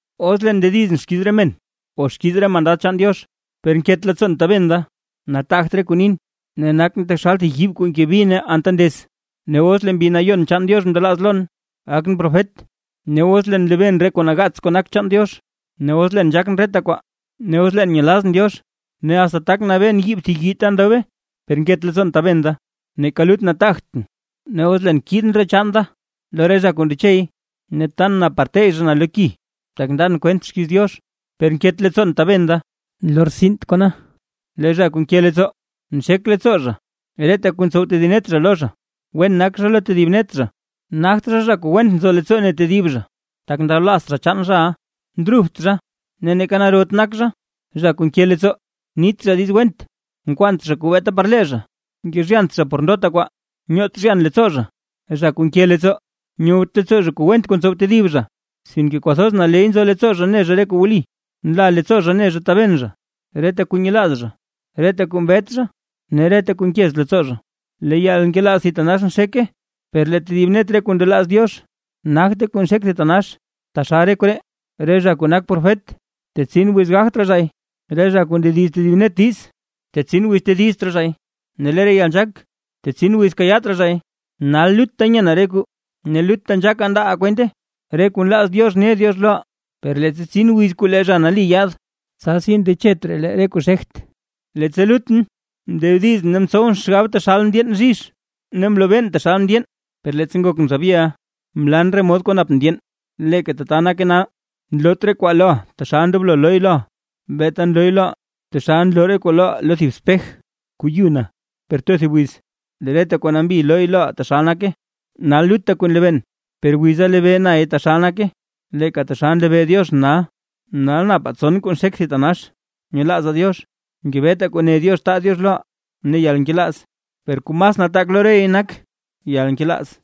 Os leen ndedizʼn xkiiz re men o xkiiz re mandad chaan Diox, per nket leettsoon taben da, nataagt re kuu nin, ne nakʼn taxal thib yiib kuu nke bi ne anta ndez. Ne os lee Mbi Nayon chaan Diox mndelaaz lon, gakʼn profet, ne os leen nlebeen re kuu nagaats kuu nak chaan Diox, ne os leen nzhaakʼn reta kwaa, ne os leen nyelazʼn Diox, ne asta tak nabeen yiib thib yii ta ndobe, per nket leettsoon taben da, neeka lut nataagtʼn. Ne os leen kiidʼn re chaan da lo re zha kuu ndechey, ne tan na par tey zha na lo ki, tak ndan kwent xkiiz Diox, per nket leettsoon taben da, nlortsint kona. Lee zha kuu nke leettsoo: nxek leettsoo zha reta kuu ntsow tedib net zha lo zha, wen nak zha lo tedib net zha, nagt zha, zha kuu went nzo leettsoo ne tedib zha, tak ndablaazt zha chaan zhaʼa, ndrubt zha ne neeka narot nak zha; zha kuu nke leettsoo, nit zha diiz went, nkwaant zha kuu beeta par lee zha, nkezhyant zha por ndota kwaa, nyoot zhyan leettsoo zha, zha kuu nke leettsoo, nyowt leettsoo zha kuu went kuu ntsow tedib zha, sinke kwathoz naley nzo leettsoo zha ne zha re kuu wli. Nla leettsoo zha ne zha taben zha, reta kuu nyelaaz zha, reta kuu mbet zha ne reta kuu nkez leettsoo zha. Lee yalnkelaaz thitanax nxeke. Per lee tedib net re kuu ndelaaz Diox, nagte kuu xek thitanax, taxal re koree: re zha kuu nak profet, tetsin wiz gagt raa zhay, re zha kuu ndediz tedib net diiz, tetsin wiz tedizt raa zhay ne lee re yalnzhaak, tetsin wiz kayaat raa zhay. Nal lutta nyenaa re kuu ne lutta nzhaakaa ndaaʼaa kwente, re kuu nlaaz Diox ne Diox loʼaa, per leettsa tsin wiz kuu lee Zha Nali yaad, tsasi ndechet raa lee re kuu xegt. Leettsa lutʼn mndedizʼn ne mtsowʼn xgab taxal ndyeen bzhizh, ne mlobeen taxal ndyeen, per leettsa ngokʼn zha byeʼa, mlan re mod kuu nap ndyeen. Leeka tata nake nal, nloot re kwaa loʼaa taxal ndoblo looy loʼaa, beeta nlooy loʼaa taxal nloo re kuu loʼaa lo thib spej kuu yu na; per too thib wiz lee reta kwaa nambita looy loʼaa taxal nake. Nal lutta kuu nlebeen, per wiza lebee nay taxal nake, leeka taxal nlebee Dioxʼn nal. Nal napaa tson kuu nxek thitanax: nyelaazaa Diox, ngebetaa kuu ne Diox taa Diox loʼaa ne yalnkelaaz; per kuu mas nataak lo rey nak yalnkelaaz.